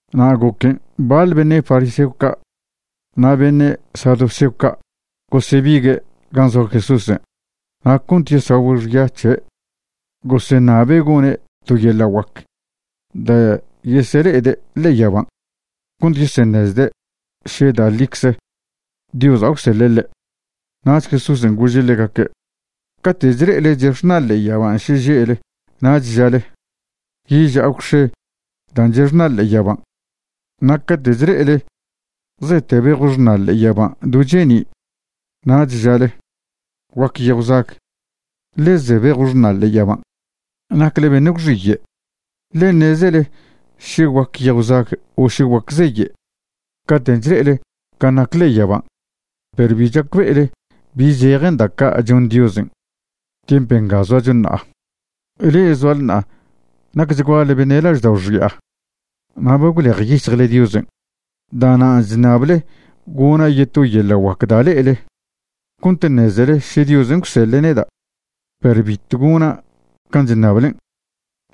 Na' goquen' baḻ beṉe' fariseo ca' na' beṉe' saduceo ca' gosebigue' gan' zoa Jesúsen', na' cont yesagüe' xya c̱he' goseṉabe' gone' to yeḻa' guac da' yesele'ede' ḻe'e yaban' cont yeseṉezde' še da' ḻicze Diosa' gwseḻe' ḻe'. Nach Jesúsen' gože' ḻegaque': ―Cate' chle'ele chexṉa ḻe'e yaban' šeže'le nach žale: “Yeža'a gwx̱e dan' chexṉa ḻe'e yaban'.” Na' cate' chle'ele zete bejw xṉa ḻe'e yaban' do cheni' nach žale: “Guac yejw zag, ḻe ze bejw xṉa ḻe'e yaban'.” Nacle beṉe' gwxiye', ḻe ṉezele še guac yejw zag o še guac zeye' caten' chle'ele can' nac ḻe'e yaban', perw bi chacbe'ele bi zejen da' ca' chon Diosen' tiemp nga zoacho ṉa'a. Le'e zoale ṉa'a nacchguale beṉe' laždao' xi'a na' ba gwlejyic̱hjle Diosen'. Da'nan' chṉable gona' yeto yeḻa' guac da' le'ele cont ṉezele še Diosen' gwseḻe' neda'. Perw bitw gona' can' chṉablen',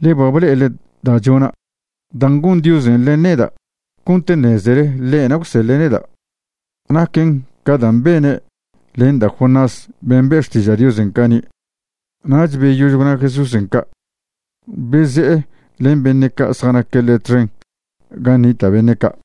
ḻe ba ble'ele da' chona'. Dan' gon Diosen' len neda' cont ṉezele ḻe'na' gwseḻe' neda' naquen ca dan' bene' len da' Jonás ben' be' xtiža' Diosen' cani'. Nach beyož gwna Jesúsen' ca', beze'e len beṉe' ca' zjanaque' ḻe' txen gan' nita' beṉe' ca'.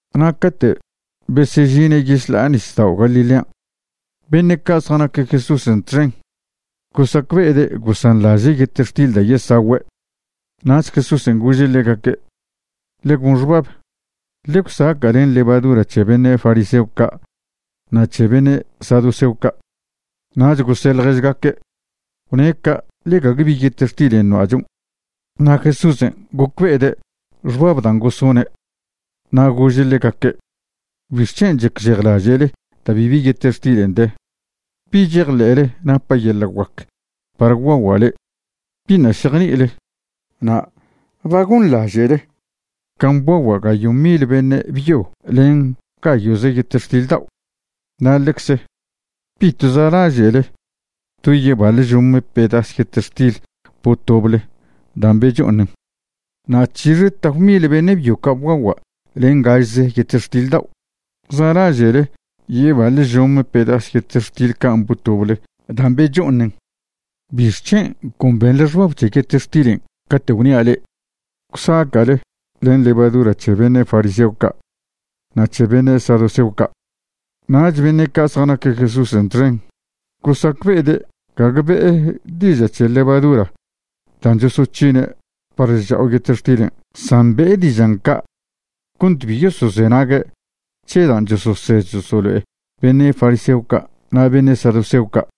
Na' cate' besežine' yešḻa'a nisdao' Galilean', beṉe' ca' zjanaque' Jesúsen' txen gosacbe'ede' gosanḻaže' yetextil da' yesagüe'. Nach Jesúsen' gože' ḻegaque': ―Ḻe gon xbab, ḻe gwsaca' len levadura c̱he beṉe' fariseo ca' na' c̱he beṉe' saduceo ca'. Nach gose' ḻježgaque': ―Gwne' ca' ḻe gague bi yetextilen' noa'chon'. Na' Jesúsen' gocbe'ede' xbab dan' gosone', na' gože' ḻegaque': ―¿Bixc̱hen' chacžejlaže'le da' bibi yetextil de? ¿Bi chejḻe'le napa' yeḻa' guac par gwguagua' le'e? ¿Biṉa' šejni'ile? na' ¿ba gonḻaže'le can' bguagua' gayo' mil beṉe' byo len gayo'ze yetextil dao'? na' ḻecze ¿bitw zalaže'le do yebaḻ žome pedas yetextil botoble dan' becho'oṉen? Na' ¿c̱hixe tap mil beṉe' byo ca' bguagua' len gažze yetextil dao'? ¿Zalaže'le yebaḻ žome pedas yetextil can' botoble dan' becho'oṉen? ¿Bixc̱hen' con benḻe xbab c̱he yetextilen' cate' gwnia' le'e gwsaca'le len levadura c̱he beṉe' fariseo ca' na' c̱he beṉe' saduceo ca'? Nach beṉe' ca' zjanaque' Jesúsen' txen gosacbe'ede' gague be'e diža' c̱he levadura dan' chosoc̱hine' par chcha'o yetextilen' san be'e dižan' ca' cont bi yosozenague' c̱he dan' chososed chosolo'e beṉe' fariseo ca' na' beṉe' saduceo ca'.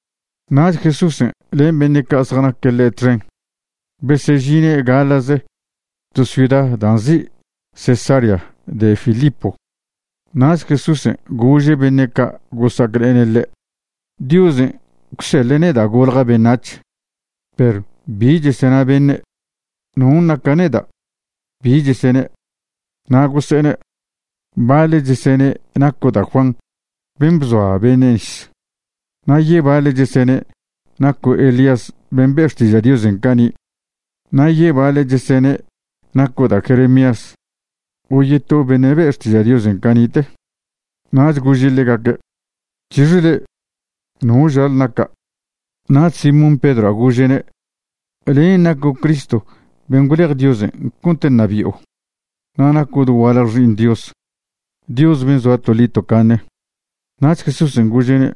Nach Jesúsen' len beṉe' ca' zjanaque' ḻe' txen besežine' gaḻa'ze to ciuda dan' nzi' Cesarea de Filipo. Nach Jesúsen' gože' beṉe' ca' gosa'aclene' ḻe': ―Diosen' gwseḻe' neda' golja' beṉac̱h. Perw ¿bi chesena beṉe'? ¿non' naca' neda'? ¿Bi chesene'? Na' gose'ene': ―Baḻe' chesene' naco' da' Juan ben' bzoa beṉe' nis. Na' yebaḻe' chesene' naco' Elías ben' be' xtiža' Diosen' cani'. Na' yebaḻe' chesene' naco' da' Jeremías o yeto beṉe' be' xtiža' Diosen' cani'te. Nach gože' ḻegaque': ―¿C̱hixe le'e? ¿No žale naca'? Nach Simón Pedroa' gože'ne': ―Len' naco' Cristo ben' gwlej Diosen' cont ṉabi'o, na' naco' dogualje Xi'iṉ Dios, Dios ben' zoa toḻi tocaṉe. Nach Jesúsen' gože'ne':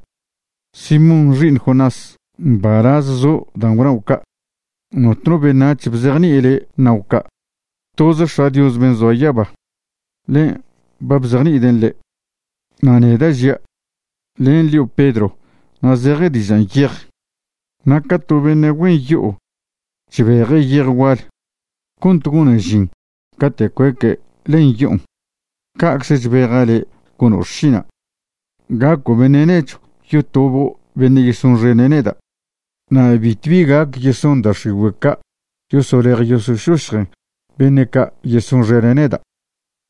―Simón xi'iṉ Jonás, mbalaz zo' dan' gwnao' ca'. Notno beṉac̱h bzejni'i le' ṉao' ca'. Toz X̱a' Dios ben' zoa yaba, ḻen' ba bzejni'iden' le'. Na' neda' žia', len' lio' Pedro na' zeje dižan' yej. Na' ca to beṉe' güen yo'o chbeje' yej gual cont gonen žin cate' cueque' len yo'on, ca'cze chbeja' le' gono' xšina', gaco' beṉe' nechw yotobo' beṉe' yesonxene' neda'. Na' bitwbi gac yeson da' x̱igüe' ca' yosolej yosošošjen beṉe' ca' yesonxene' neda'.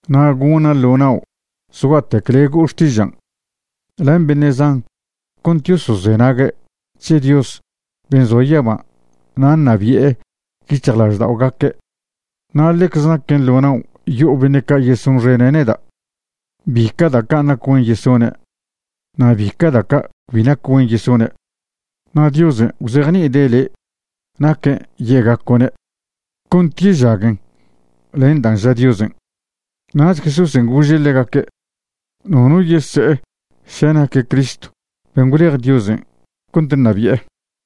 Na' gona' ḻo nao' zgua'tec le' go'o xtižan' len beṉe' zan cont yosozenague' c̱he Dios ben' zoa yaban' na' ṉabi'e yic̱hjlažda'ogaque'. Na' ḻecze naquen ḻo nao' yo'o beṉe' ca' yesonxene' neda' bica' da' ca' nac güen yesone' na' bica' da' ca' cbi nac güen yesone'. Na' Diosen' gwzejni'ide' le' naquen' ye'gaco'ne' cont yežaguen len dan' ža Diosen'. Nach Jesúsen' gože' ḻegaque' nono yese'e še naque' Cristo ben' gwlej Diosen' cont ṉabi'e.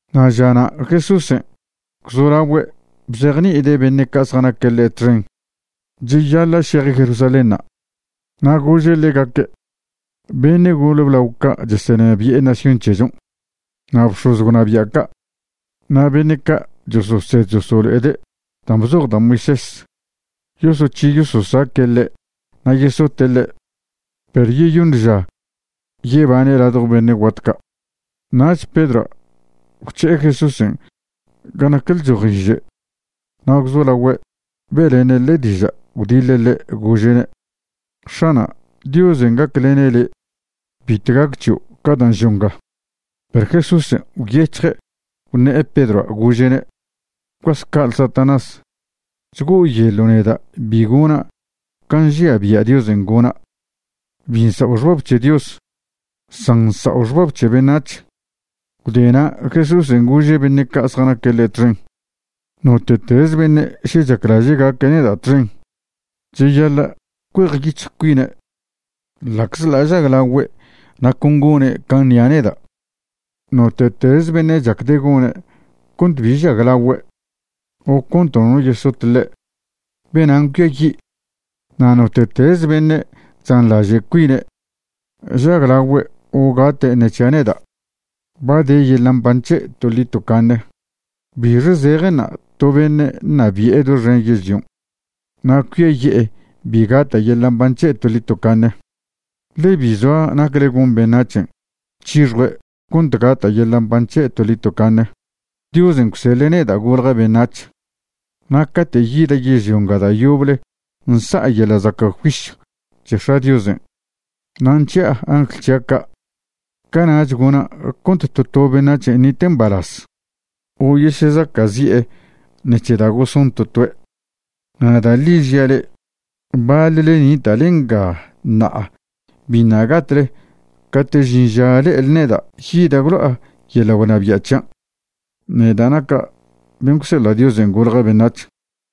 Na' žana' Jesúsen' gwzolagüe' bzejni'ide' beṉe' ca' zjanaque' ḻe' txen cheyaḻa' šeje' Jerusalénṉa'. Na' gože' ḻegaque' beṉe' gole blao ca' chesenabi'e nación c̱hechon', na' bx̱oz gwnabia' ca' na' beṉe' ca' chososed chosolo'ede' dan' bzoj da' Moisés yosoc̱hi yososaque' ḻe' na' yesote' ḻe'. Perw yeyoṉ ža yebane' ladjo beṉe' guat ca'. Nach Pedroa' gwc̱he'e Jesúsen' gan' nac lchojiže na' gwzolagüe' be'lene' ḻe' diža' gwdiḻe' ḻe', gože'ne': ―X̱ana', Diosen' gaclene' le'. Bitw gac c̱hio' ca dan' žo' nga. Perw Jesúsen' gwyec̱hje' gwṉe'e Pedroa' gože'ne': ―¡Gwcuas ca'ale Satanás! Chgo'oyeḻo' neda' bi gona' can' nžia bia' Diosen' gona'. Bi nsa'o xbab c̱he Dios, san nsa'o xbab c̱he beṉac̱h. Gwde na' Jesúsen' gože' beṉe' ca' zjanaque' ḻe' txen: ―Note'teze beṉe' še chaclaže' gaque' neda' txen, cheyaḻa' cuejyic̱hj cuine' ḻa'czḻa' žaglagüe' na' con gone' can' ṉia' neda'. Note'teze beṉe' chacde' gone' cont bi žaglagüe' o cont nono yesot ḻe', benan' cuiayi'. Na' note'teze beṉe' chzanḻaže' cuine' žaglagüe' o gate' ṉe c̱hia' neda', ba de yeḻa' mban c̱he' toḻi tocaṉe. ¿Bixe zejenṉa' to beṉe' ṉabi'e doxen yežlion' na' cuiaye'e bi gata' yeḻa' mban c̱he' toḻi tocaṉe? Ḻe bi zoa nacle gon beṉac̱hen' c̱hixjue' cont gata' yeḻa' mban c̱he' toḻi tocaṉe. Diosen' gwseḻe' neda' golja' beṉac̱h na' cate' yida' yežlio nga da' yoble nsa'a yeḻa' zaca' juisyw c̱he X̱a' Diosen' na' nc̱hi'a angl c̱hia' ca', cana'ch gona' cont to to beṉac̱hen' ṉite' mbalaz o yesezaca'zi'e ṉec̱he da' goson to toe'. Na' da' ḻi žia' le'e, baḻle nita'le nga ṉa'a biṉa' gatle cate' žin ža le'ele neda' yida' gwlo'a yeḻa' gwnabia' c̱hian', neda' naca' ben' gwseḻa' Diosen' golja' beṉac̱h.